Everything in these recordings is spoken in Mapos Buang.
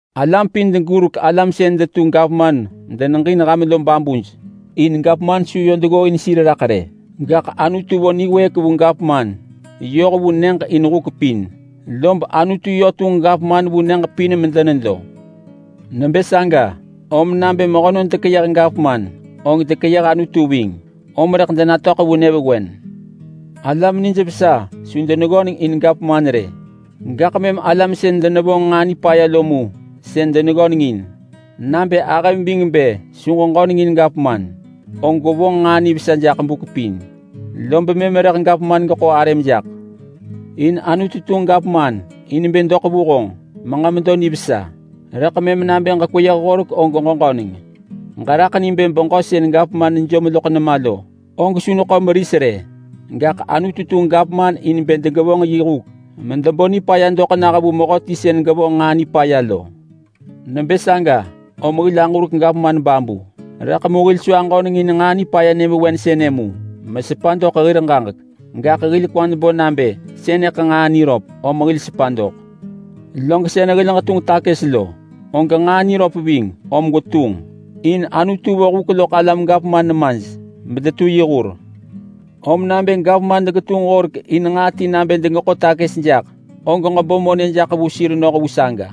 Ham pin ġurek alam sën detu gavman medeneġin ham lo babuj. In gavman su yö deggooin sir raḳ rë, gaḳ Anutu vo niwëëk vu gavman vu nyëġ pin in huk pin. Lob Anutu yö tunġ gavman vu nyëġ pin medenedo. Nebë saga om nabë mehönon dekeyëh gavman, og dekeyëh Anutu ving. Om rëḳ denatöḳ vu nyëvewen. Alam nijvesa su deneggöneng in kiap rë, gaḳ mëm alam sën denevonġ nġaa nipaya lo mu mëm deneggöneng in. Nabë ahëm ving bë su ġeġöneng in gavman, og gwevonġ nġaa nivesa jaḳ buk pin, lob mëm rëḳ gavman geḳo arëm jaḳ. In Anutu tunġ gavman in bë doḳ vu honġ meġemedo nivesa. Rëḳ mëm nabë ġekweyëh horek og ġeġöneng. Ġeraḳ ni bë beġö sën nejom loḳ nema lo, og su neḳo meris rë. Gaḳ Anutu tunġ gavman in bë degevonġ yi huk medebo nipaya doḳ nah vu mehöti sën gevonġ nġaa nipaya lo. Nebë saga om hil aġurek gavman babu. Rëḳ mu hil su aġöneng in nġaa nipaya nyëvewen sënë mu mesepa doḳ hir ġaġek, gaḳ hil kwad bo nabë sënëḳ nġaa niröp, om hil sepa doḳ. Log sën hil ġetunġ takës lo, og nġaa niröp ving, om gwetunġ in Anutu vo huk loḳ alam gavman nemaj medetu yi hur. Om nabë gavman degetunġ horek in nġaa ti nabë degeḳo takës jaḳ, og ġebo monë jaḳ vu sir noh vu saga.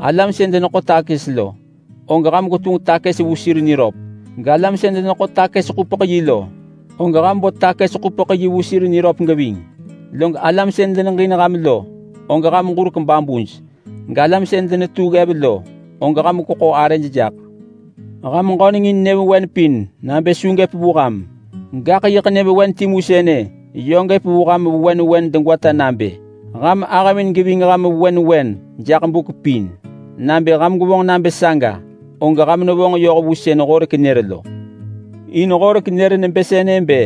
Alam sën deneḳo takës lo, og ham gwetunġ takës vu sir niröp. Galam sën deneḳo takës-ḳupeḳ-yi (kastams) lo, og ham bo takës-ḳupeḳ-yi vu sir niröp geving. Log alam sën deneġin ham lo, og ham ġurek babuj, galam sën denetu ggev lo, og ham gweḳo arëj jaḳ. Ham ġöneng in nyëvewen pin nabë su gëp vu ham. Gaḳ yiḳ nyëvewen timu sënë yö gëp vu ham vewen vewen degwata nabë: Ham ahëmin geving ham vewen vewen jaḳ buk pin. Nabë ham gwevonġ nabë saga, og ham nevonġ yoh vu sën Horek nër lo. In Horek nër nebë sënë bë,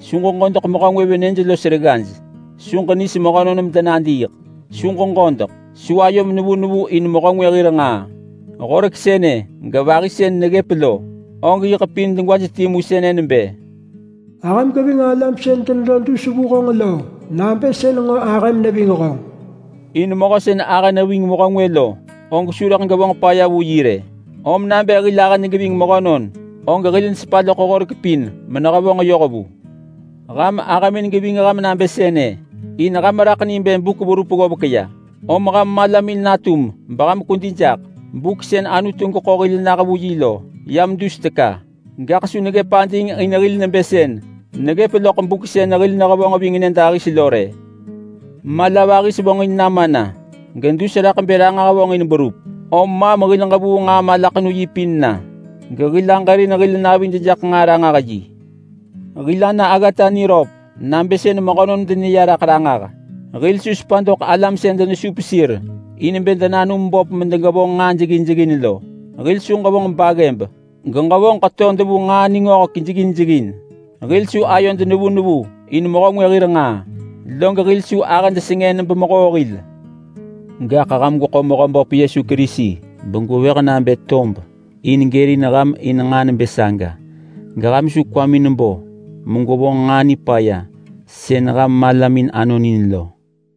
“Su ġeġodeḳ mehö ngwë venëj los reggaj. Su ġengis mehönon medenadiiḳ. Su ġeġodeḳ. Su ayom nevu nevu in mehö ngwë hir nġaa.” Horek sënë gevahi sën neggëp lo, og yiḳ pin degwaj timu sënë nebë, “Ahëm geving alam sën denedo dus vu honġ lo nabë sën nġo ahëm neving honġ.” In mehö sën ahë neving mehö ngwë lo, og su rëḳ gevonġ paya vu yi rë. Om nabë hil ahëd geving mehönon, og hil nesepa loḳ horek pin menehevonġ yoh vu. Ham ahëmin geving ham nabë sënë in ham raḳ ni bë buk verup ggovek ya, om ham malamin natum beham kwedi jaḳ. Buk sën Anutu geḳo hil nah vu yi lo yam dus teka, gaḳ su neggëp ading in hil nebë sën neggëp loḳ buk sën hil nehevonġ ving nyëdahis lo rë. Mala vahis vonġin nama na gedus raḳ bë ranġah vonġin berup. Om maḳ hil ġevuu nġaa malaḳenu yi pin na, gehil aġërin hil navid jaḳ nġaa ranġah yi. Hil ana aggata niröp nabë sën mehönon deneya ranġah. Hil su sepa doḳ alam sën denesup sir in bë denanum böp medegevonġ nġaa jeggin jeggin lo. Hil su ġevonġ baggëb geġevonġ ḳetod vu nġaa ningöhek jeggin jeggin. Hil su ayod nevu nevu in mehö ngwë hir nġaa, log hil su ahëd sengën bemehoo hil. Gaḳ ham gweḳo Mehöböp Yesu Kerisi begwevëh nabë tob in gërin ham in nġaa nebë saga. Geham su kwamin bo megwevonġ nġaa nipaya sën ham malamin anon in lo.